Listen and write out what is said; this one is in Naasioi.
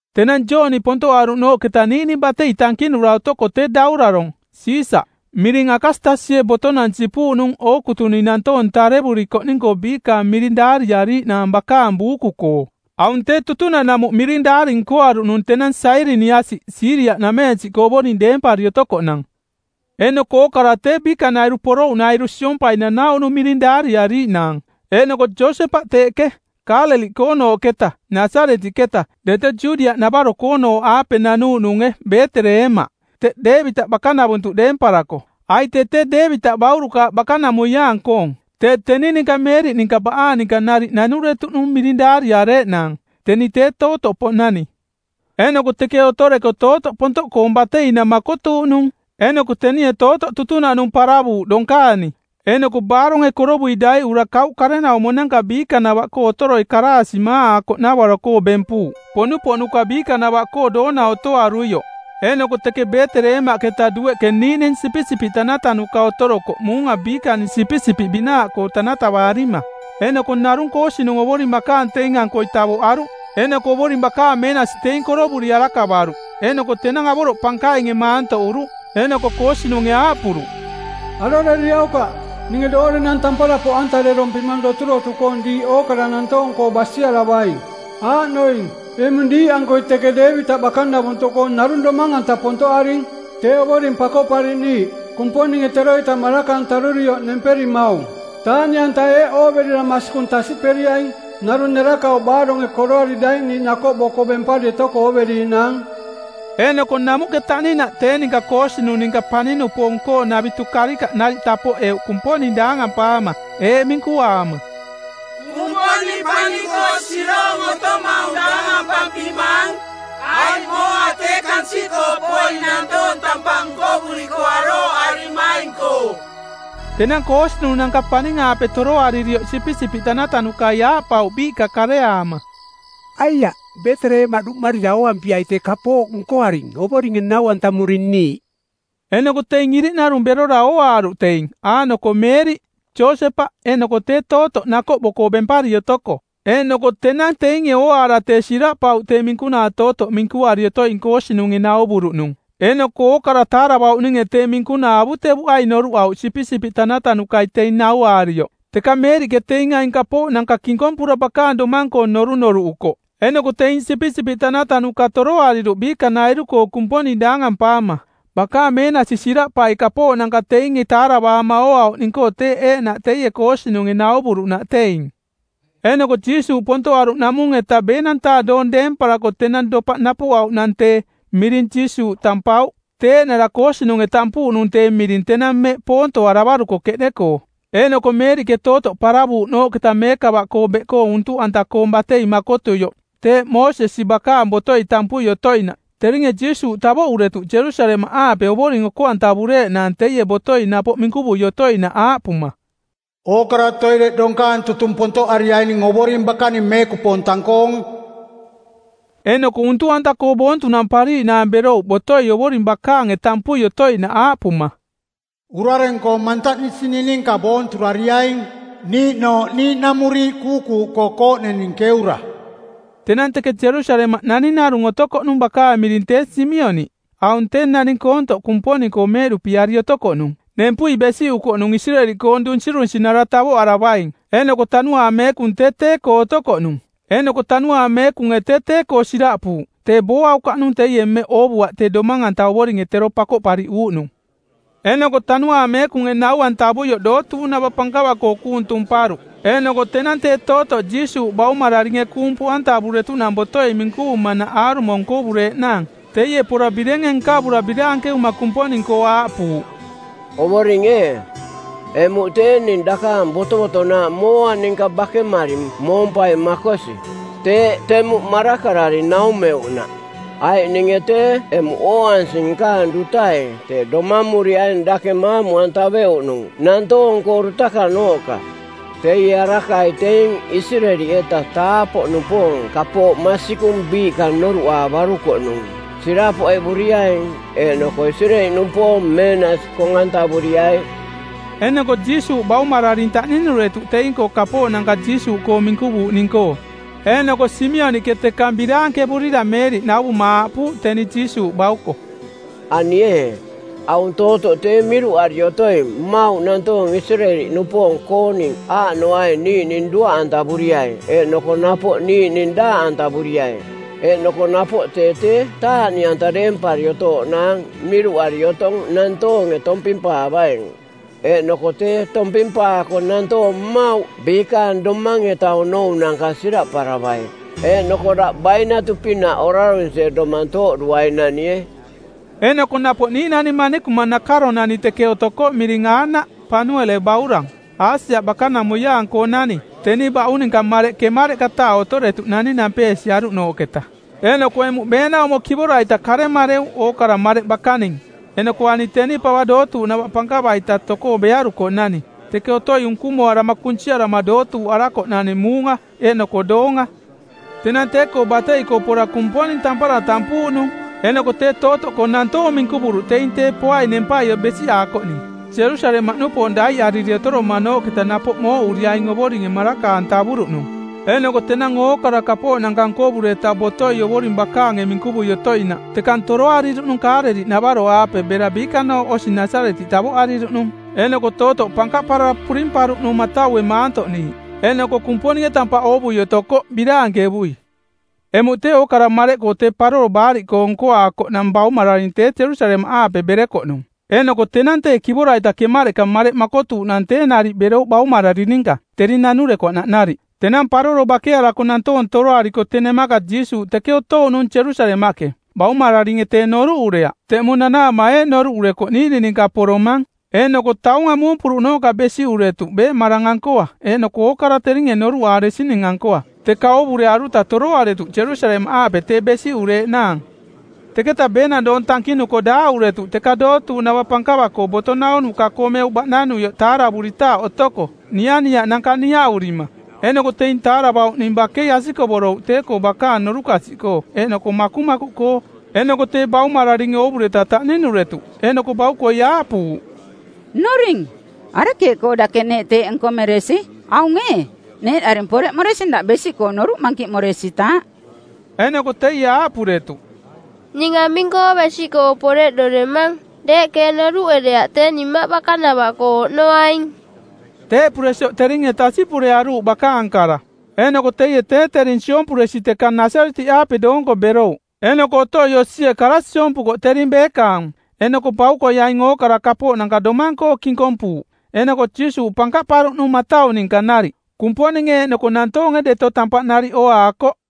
Tenang Jooni pontoꞌaruꞌnooꞌketa niiꞌning batei tankinura otoko tee daurarong˜, Siisaꞌ, miring Akastasie botonang sipuuꞌnung ookutuning nantoong tarevurikoꞌning-koo biikaang miring daariariiꞌnaang bakaang buuku-koo. Aung tee tutunaꞌnamuꞌ miring daari nkoaruꞌnung tenang Sairiniasiꞌ Siiria-nameensiꞌkoo ovoring deempari otokoꞌnang. Eeꞌnoko ookara tee biikanairu porouꞌnairu siompai nanauꞌnung miring daariariiꞌnaang. Eeꞌnoko Josepaꞌ teeꞌke, Kaaleliꞌkoonooꞌketa, Nasaretiꞌketa, deto Judiaꞌnavaro-koonooꞌaape nanuuꞌnunge Beeteleemaꞌ, teꞌ Deevitaꞌ bakanavuntuꞌ deemparako, aiꞌ tee tee Deevitaꞌ baurukaaꞌ bakanamuiaang-koong. Tee teni ninka Meeriꞌ ninka baꞌaang ninka nariꞌ nanuretuꞌnung miring daariareeꞌnaang. Teni tee tootoꞌpoꞌnani. Eeꞌnoko teke otoreko tootoꞌ pontoꞌkoong bateinang makotuuꞌnung. Eeꞌnoko tenie tootoꞌ tutunaꞌnung paravuuꞌ donkaani, eeꞌnoko baaronge korovui daiꞌura kauꞌ karenaumonanka biikanava-koo otoroi karaasiꞌ maaꞌaakoꞌnavaro-koo bempuuꞌ, poꞌnupoꞌnuka biikanavaꞌkoo doona otoaruioꞌ. Eeꞌnoko teke Beeteleemaꞌketa dueꞌke niiꞌning sipisipiꞌ tanatanuka otorokoꞌ muunga biikaning sipisipiꞌ binaaꞌkoo tanatavaarima. Eeꞌnoko narung koosinung Ovoring bakaang teing-ankoi tavoꞌaruꞌ, eeꞌnoko Ovoring bakaang meenasi teing korovuri arakavaruꞌ eeꞌnoko tenang avoroꞌ pankainge maantoꞌuruꞌ. Eeꞌnoko koosinunge aaꞌpuruꞌ, “Aroreriaukaꞌ, ninge doorenang tampara poꞌantarerompimang doturotu-koong diiꞌ ookara nantoong-koo basiaravaing. Aaꞌnoing eꞌmung diiꞌankoi teke Deevitaꞌ bakanavuntuꞌkoo narung Domang-anta pontoꞌaring, tee Ovoring Pakoꞌpariꞌniiꞌ, Kumponinge teroita maraka-antarurioꞌ nemperimaung. Taaꞌniꞌanta eeꞌ ooverira masikung tasiꞌperiaing: Narung nerakauꞌ baaronge koroari daiꞌniiꞌ nakoꞌbo-koo bempari otoko ooveriiꞌnaang.” Eeꞌnoko namuꞌke taꞌninaꞌ, tee ninka koosinung ninka paning-nupoong-koonavitu karikaꞌ nariꞌ tapoꞌeuꞌ Kumponing daangampaama eeꞌ minkuaama, “Kumponing paning-koo siroong otomaung daangampampimaang, aiꞌ mooa tee kansiꞌkoo poing nantoong tampaꞌ nkovuriko arooꞌarimaing-koo.” Tenang koosinunanka paning-aape toroaririoꞌ sipisipiꞌ tanatanukai aaꞌpauꞌ biiꞌka kareaama, “Aiaꞌ, Beeteleemaꞌ duꞌmarira, ooampiai tee kapooꞌ nkoaring Ovoringe nau-antamuring niiꞌ.” Eeꞌnoko teing iriꞌnarung berora ooaaruꞌ teing, aaꞌnoko Meeriꞌ, Josepaꞌ eeꞌnoko tee tootoꞌ nakoꞌbo-koo bempari otoko. Eeꞌnoko tenang teinge ooaara tee siraꞌpauꞌ tee minkunaa tootoꞌ minkuari otoing koosinunge nauvuruꞌnung. Eeꞌnoko ookara taaravauꞌninge tee minkunaa avutevuꞌai noruꞌauꞌ sipisipiꞌ tanatanukai teing nauaarioꞌ. Teka Meeriꞌke teing aing kapooꞌnanka kinkompura bakaang domang-koo norunoruꞌukoꞌ. Eeꞌnoko teing sipisipiꞌ tanatanuka toroariruꞌ biikanairu-koo Kumponing daangampaama, bakaang meenasi siraꞌpai kapooꞌnanka teinge taaravaama ooauꞌning-koo teeꞌ eeꞌnaꞌ teie koosinunge nauvuruꞌnaꞌ teing. Eeꞌnoko Jiisuuꞌ pontoꞌaruꞌnaꞌmung-eta ˜beenang-taa doong deemparako tenang dopaꞌ napuꞌauꞌnang tee, miring Jiisuuꞌ tampauꞌ, tee eeꞌnara koosinunge tampuuꞌnung tee miring tenang mmeꞌ poontoaravaruko˜ keꞌde-koo. Eeꞌnoko Meeriꞌke tootoꞌ paravuuꞌnooꞌketa meekava-koo beꞌkoo untuꞌanta-koong batei makotuioꞌ, teeꞌ Moosesi bakaang botoi tampui otoinaꞌ, teringe Jiisuuꞌ tavoꞌuretuꞌ Jerusalemaꞌaape Ovoring oko-antavureeꞌnaang teie botoi napoꞌ minkuvui otoinaꞌ aaꞌpuma, “Ookara toireꞌ donkaang tutung pontoꞌariaining Ovoring bakaning meekupoong tang-koong.” Eeꞌnoko untuꞌanta-koo boontunampariiꞌnaang berouꞌ botoi Ovoring bakaange tampui otoinaꞌ aaꞌpuma, “Urareng-koo˜ mantaꞌnisining ninka boonturariaing niiꞌnooꞌ niiꞌnamuriiꞌ kuukuuꞌkoo kooꞌnening keura.” Tenang teke Jerusalemaꞌ naning narung otokoꞌnung bakaang miring tee Simioniꞌ. Aung tee naning koontoꞌ Kumponing-koo meeꞌduꞌpiari otokoꞌnung. Nempui besiꞌukoꞌnung Isireeli-koong Dun-sirunsinara˜ tavoꞌaravaing, eeꞌnoko Tanuaang Meekung tee tee-koo otokoꞌnung. Eeꞌnoko Tanuaang Meekunge tee tee-koo siraꞌpuuꞌ tee booaukaꞌnung teie mmeꞌ oovuaꞌ tee Domang-anta Ovoringe tero Pakoꞌpariꞌuuꞌnung˜. Eeꞌnoko Tanuaang Meekunge nau-antavuioꞌ dootuuꞌnava pankava-koo kuung tumparuꞌ; Eeꞌnoko tenang tee tootoꞌ Jiisuuꞌ baumararinge kuung poꞌantavuretuꞌnang botoi minkuvumanaꞌ aarumo nkovureeꞌnaang, teie pora birenge nkavura biraankevuma Kumponing-koo aaꞌpuuꞌ, “Ovoring ee, emuꞌ tee ning dakaang botovotonaaꞌ mooa ninka bakemari moompaing makosi, teeꞌ temuꞌ marakarari naumeuꞌnaꞌ, aiꞌ ninge tee emuꞌ ooansing nkaang dutai Tee Domamuriaing dake maamu-antaveuꞌnung nantoong-koo dutakanooꞌka. Teie Arakai teing Isireeli-eta taapoꞌnupoong kapooꞌ masikung biiꞌka noruꞌaavarukoꞌnung sirapoꞌevuriaing eeꞌnoko Isireeli-nupoong meenasi kong-antavuriai.” Eeꞌnoko Jiisuuꞌ baumararing taꞌninuretuꞌ teing-koo kapooꞌnanka Jiisuuꞌkoo minkuvuuꞌning-koo. Eeꞌnoko Simioniꞌke tekang biraankevurira Meeriꞌ nauvuma aaꞌpuuꞌ teni Jiisuuꞌ bauko, “Ani ee, aung tootoꞌ tee miruꞌari otoing mmauꞌ nantoong Isireeli-nupoong-kooning aaꞌnoaing niiꞌning duaꞌantavuriai eeꞌnoko napoꞌ niiꞌning daaꞌantavuriai; Eeꞌnoko napoꞌ tee tee taaꞌniꞌanta deempari otooꞌnaang miruꞌari otong nantoonge tompimpaavaing, eeꞌnoko teeꞌ tompimpaako nantoong mmauꞌ biikaang domang-eta onounanka siraꞌparavai. Eeꞌnoko daꞌ bainatu-pinaꞌ orarunsie domang tooꞌduainanie.” Eeꞌnoko napoꞌ niiꞌnani manikuma nakaronani teke otokoꞌ miring Aanaꞌ, Panuele baurang, Aasia bakanamuiaang-koonani. Teni baꞌung ninka mareꞌ ˜kemareꞌka-taa otoretuꞌnani nampeesiaruꞌnooꞌketa, eeꞌnoko emuꞌ beenaumo kivora-ita karemareu ookara mareꞌ bakaning; Eeꞌnoko ani teni pava dootuuꞌnava pankava-ita tokoo bearukoꞌnani; teke otoi unkumoarama kunsiarama dootuuꞌarakoꞌnani muunga eeꞌnoko doonga. Tenang tee-koo batei-koo pora Kumponing tampara tampuuꞌnung eeꞌnoko tee tootoꞌkoo nantoong minkuvuruꞌ teing Tee Poaing nempai besiꞌaakoꞌning Jerusalemaꞌnupoong daiꞌariri otoromanooꞌketa napoꞌ mooꞌuriaing Ovoringe maraka-antavuruꞌnung. Eeꞌnoko tenang ookara kapooꞌnanka nkovureta botoi Ovoring bakaange minkuvui otoinaꞌ tekang toroariruꞌnung Kaaleliꞌnavaro-aape bera biikanooꞌ osi Nasaretiꞌ tavoꞌariruꞌnung. Eeꞌnoko tootoꞌ pankaꞌparara purimparuꞌnung mataue maantoꞌniiꞌ, eeꞌnoko Kumponinge tampaꞌ oovui otokoꞌ biraankevui. Emuꞌ tee, ookara mareꞌkoo tee Paroro Baariꞌkoong˜ nkoaakoꞌnang baumararing tee Jerusalemaꞌaape berekoꞌnung. Eeꞌnoko tenang tee kivora-ita kemareꞌka mareꞌ makotuuꞌnang tee nariꞌ berouꞌ baumararing ninka, tering nanurekoꞌnaꞌ nariꞌ. Tenang paroro bakearako nantoong toroariko tee nemaka Jiisuuꞌ teke otouꞌnung Jerusalemaꞌke. Baumararinge tee noruꞌureaꞌ. Teꞌmung nanaama eeꞌ noruꞌurekoꞌ, niiꞌning ninka poromang. Eeꞌnoko taunga muumpuruꞌnooꞌka besiꞌuretuꞌ beeꞌmarang-ankoa eeꞌnoko ookara teringe noruꞌaaresining-ankoa. Teka oovurearuta toroaretuꞌ Jerusalemaꞌaape tee besiꞌureeꞌnaang. Teketa beenang doong tankinuko daaꞌuretuꞌ teka dootuuꞌnava pankava-koo boto naunuka-koo meuꞌ baꞌnanuioꞌ taaravuritaaꞌ otoko nianiaꞌnanka niaꞌurima. Eeꞌnoko teing taaravauꞌning bakei asikovorouꞌ tee-koo bakaang norukasiꞌkoo eeꞌnoko makumakuꞌkoo. Eeꞌnoko tee baumararinge oovureta taꞌninuretuꞌ, eeꞌnoko baukoi aaꞌpuuꞌ, “Nnuring, arekeeꞌkoo dake neeꞌ teeꞌ nkomeresi? Aung ee, neeꞌdaring poreꞌmoresing daꞌ besiꞌkoo noruꞌ mankiꞌmoresitaaꞌ.” Eeꞌnoko teie aaꞌpuretuꞌ, “Ning aming-koo besiꞌkoo poreꞌdoremang? Deeꞌke ee noruꞌereaꞌ tee ning Mmaꞌ bakanava-koo oꞌnoaing?” Teeꞌpuresioꞌ teringe tasiꞌpurearuuꞌ bakaang kara. Eeꞌnoko teie tee tering siompuresi tekang Nasaretiꞌaape doonko berouꞌ, eeꞌnoko otoi osie kara siompukoꞌ tering beekaang. Eeꞌnoko baukoi aing ookara kapooꞌnanka domang-koo kinkompuuꞌ. Eeꞌnoko Jiisuuꞌ pankaꞌparuꞌnung matau ninka nariꞌ. Kumponinge eeꞌnoko nantoonge deto tampaꞌ nariꞌ ooaakoꞌ.